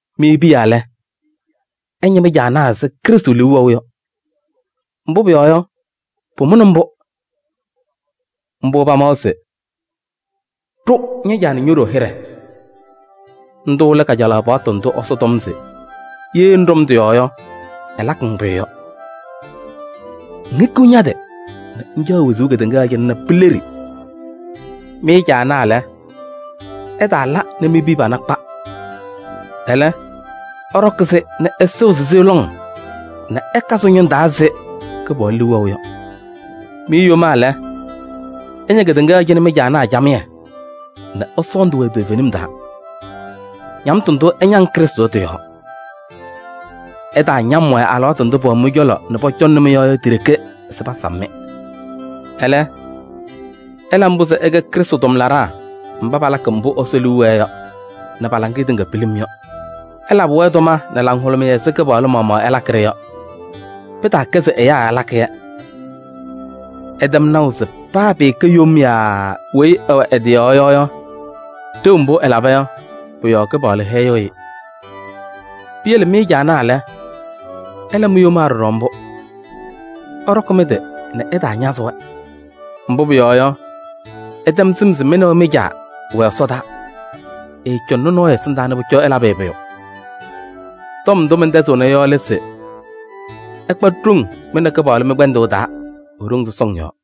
Mɩ piya lɛ, ɩña mɩ-ñɩma ɛzɩ Kɩpaɣlʋ liu wɛʋ yɔ. Mbʋ pʋyɔɔ yɔ, pʋmʋnɩ mbʋ. Mbʋ pamawa se: “Ɖʋ ña-caa nɛ ño-ɖoo hɩɖɛ.” Ndʋ lɛ kajalaɣ paɣtʋ ndʋ Ɛsɔ tɔm se ye ŋɖɔm tɩ-yɔɔ yɔ, ɛlakɩ-ŋ pʋyʋ yɔ: “Ŋhikiɣ ña-tɩ nɛ ŋcaɣ wezuu kedeŋa yɔɔ cɩnɛ nɛ pileɖi.” Mɩ caanaa lɛ, ɩtaala nɛ mi-piya pana kpa. Ɛlɛ, ɩɖɔkɩ-sɩ nɛ ɩsɩɣzɩ-sɩ lɔŋ nɛ ɩka sɩ-ñʋŋ taa ɛzɩ Kɩpaɣlʋ liu wɛʋ yɔ. Mɩ yomaa lɛ, ɩña kedeŋa yɔɔ cɩnɛ mɩ-caanaa camɩyɛ nɛ ɩsɔɔndɩ-wɛ toovenim taa, ñamtʋ ndʋ ɩñaŋ Krɩstʋ yɔ tɩ-yɔɔ. Ɩtaañam-wɛ alɩwaatʋ ndʋ pɛwɛ mɩ-cɔlɔ nɛ pɔcɔŋnɩ-mɩ yɔ ti-ɖeke se pasam-mɩ. Ɛlɛ, ɩla mbʋ se ɩkɛ Krɩstʋ tʋmlaɖaa mba palakɩ mbʋ Ɛsɔ liu wɛɛ yɔ nɛ pa-laŋɩyɛ tɩŋa pilim yɔ. Ɩlabɩ-wɛ tʋma nɛ laŋhʋlʋmɩyɛ ɛzɩ Kɩpaɣlʋ maɣmaɣ ɩlakɩ yɔ. Pɩtaakɛ se ɛyaa ɩlakɩ-yɛ. Ɩtɛm naʋ se paa pɩɩkɛ yom yaa weyi ɛwɛ ɛ-tɩ yɔɔ yɔ, ɖeu mbʋ ɛlaba yɔ, pʋ-yɔɔ Kɩpaɣlʋ hɛyɩɣ-ɩ. Piyele mɩ caanaa lɛ, ɩla mi-yomaa ɖɔɖɔ mbʋ. Ɩɖɔkɩ mɩ-tɩ nɛ ɩtaañazɩ-wɛ. Mbʋ pʋyɔɔ yɔ, ɩtɛm sɩm se mɩ nɛ wɛ mɩ-Caa wɛ ɛsɔdaa. Ɛɛcɔŋnɩ nɔɔyʋ ɛsɩndaa nɛ pʋcɔ ɛlabɩ-ɩ pʋyʋ. Tɔm ndʋ mɛntɛzɩɣna yɔ lɛ se: ɩkpa ɖoŋ mɩ nɛ Kɩpaɣlʋ mɩ-kpɛndʋʋ taa e-ɖoŋ sɔsɔŋ yɔɔ.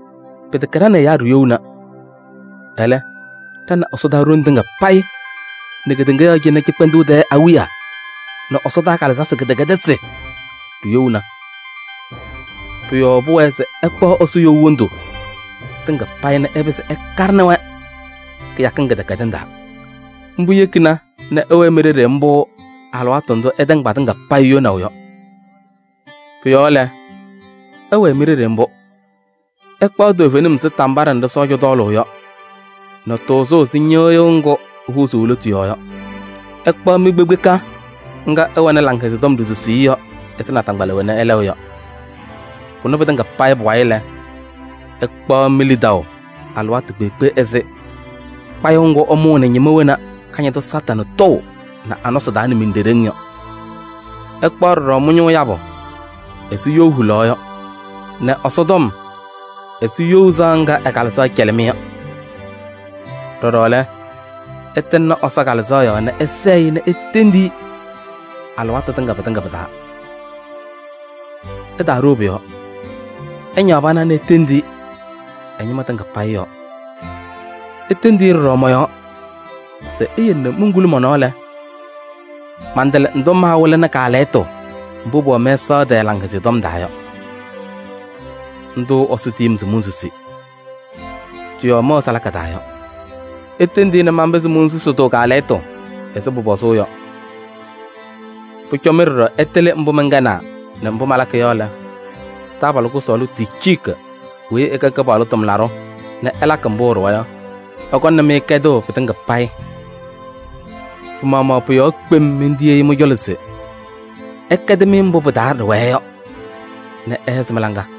Pɩtɛkɛ ɖa nɛ ɛyaa ɖiyouna. Ɛlɛ, ɖa nɛ ɛsɔdaa ɖoŋ tɩŋa payɩ nɛ kedeŋa yɔɔ cɩnɛ cɩkpɛndʋʋ tɛɛ awiya nɛ ɛsɔdaa kalɩzasɩ kɩdɛkɛdɩsɩ ɖiyouna. Pʋ-yɔɔ pʋwɛɛ se ɩkpaɣ Ɛsɔ you wondu tɩŋa payɩ nɛ ɩpɩzɩ ɩkaɖɩnɩ-wɛ kɩyakɩŋ kɩdɛkɛdɩŋ taa. Mbʋ yekina nɛ ɩwɛɛ mi-ɖeɖe mbʋ alɩwaatʋ ndʋ ɩtɛŋ patɩŋa payɩ yonaʋ yɔ. Pʋ-yɔɔ lɛ, ɩwɛɛ mi-ɖeɖe mbʋ: ɩkpaɣ toovenim ɛzɩ tambaɖɛ nɖɩ sɔɔja tɔɔlʋʋ yɔ nɛ tʋʋzʋʋ ɛzɩ ñɩɣyʋʋ ŋgʋ ehuuzuu e-lotu yɔɔ yɔ. Ɩkpaɣ mi-kpekpeka ŋga ɩwɛnɩ Laŋhɛzɩyɛ Tɔm ɖisusiye yɔ ɛzɩ nataŋgbala wena ɩlɛɣ yɔ. Pʋnɛ pɩtɩŋa pʋ-wayɩ lɛ, ɩkpaɣ mi-lidaʋ alɩwaatʋ kpeekpe ɛzɩ kpayʋʋ ŋgʋ ɩmʋʋnɩ ñɩma wena Kañadʋ Satanɩ tɔʋ nɛ a-nɔsɩ taa nɛ miɖeɖeŋ yɔ. Ɩkpaɣ ɖɔɖɔ mɩ-ñʋʋ yabʋ ɛzɩ you hulaɣ yɔ nɛ Ɛsɔtɔm ɛzɩ you sɩɣa ŋga ɛ-Kalɩzaɣ cɛlɩ-mɩ yɔ. Ɖɔɖɔ lɛ, ɩtɩŋnɩ Ɛsɔ Kalɩzaɣ yɔɔ nɛ ɩsɛɛ-ɩ nɛ itendi-i alɩwaatʋ tɩŋa pɩtɩŋa pɩ-taa. Ɩtaaɖoo pʋ-yɔɔ, ɩñaɣ pana nɛ itendi-i ɛ-ñɩma tɩŋa yɔɔ. Itendi-i ɖɔɖɔ mɔ-yɔɔ se eyele nɛ monkuli mɔ-nɔɔ lɛ, mantɩlɩ ndʋ maawɩlɩnɩ kaalɛyɩtʋ mbʋ pʋwɛ mɛsaɣ tɛɛ Laŋhɛzɩyɛ Tɔm taa yɔ. Ndʋ Ɛsɔ tiyi-m se monsusi, tɩ-yɔɔ mɛwɛ salaka taa yɔ. Itendi-i nɛ manpɩzɩ monsusi-tʋ kaalɛyɩtʋ ɛzɩ pʋpɔzʋʋ yɔ. Pʋcɔ mɩ ɖɔɖɔ ɩtɩlɩ mbʋ mɛnkɛnaa nɛ mbʋ malakɩ yɔ lɛ, taabalʋ kʋsɔɔlʋ Ticiiki weyi ɛkɛ Kɩpaɣlʋ tʋmlaɖʋ nɛ ɛlakɩ mbʋ ɛɖʋwa yɔ, ɛkɔŋnɩ-mɩ kɛdʋʋ pɩtɩŋa payɩ. Pɩ-maɣmaɣ pʋ-yɔɔ kpem mentiyi-i mɩ-cɔlɔ se ɛkɛdɩ-mɩ mbʋ pɩ-taa ɖɩwɛɛ yɔ nɛ ɛhɛzɩ mɩ-laŋa.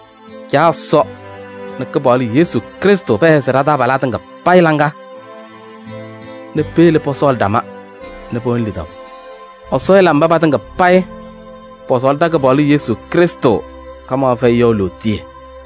Caa Ɛsɔ nɛ Kɩpaɣlʋ Yesu Krɩstʋ pɛhɛzɩ taabalaa tɩŋa laŋa nɛ peyele pɔsɔɔlɩ ɖama nɛ pɛwɛnɩ lidaʋ. Ɛsɔ ɛla mba patɩŋa payɩ pɔsɔɔlɩ ɖa-Kɩpaɣlʋ Yesu Krɩstʋ kamaɣ fɛyɩ yɔ lootiye!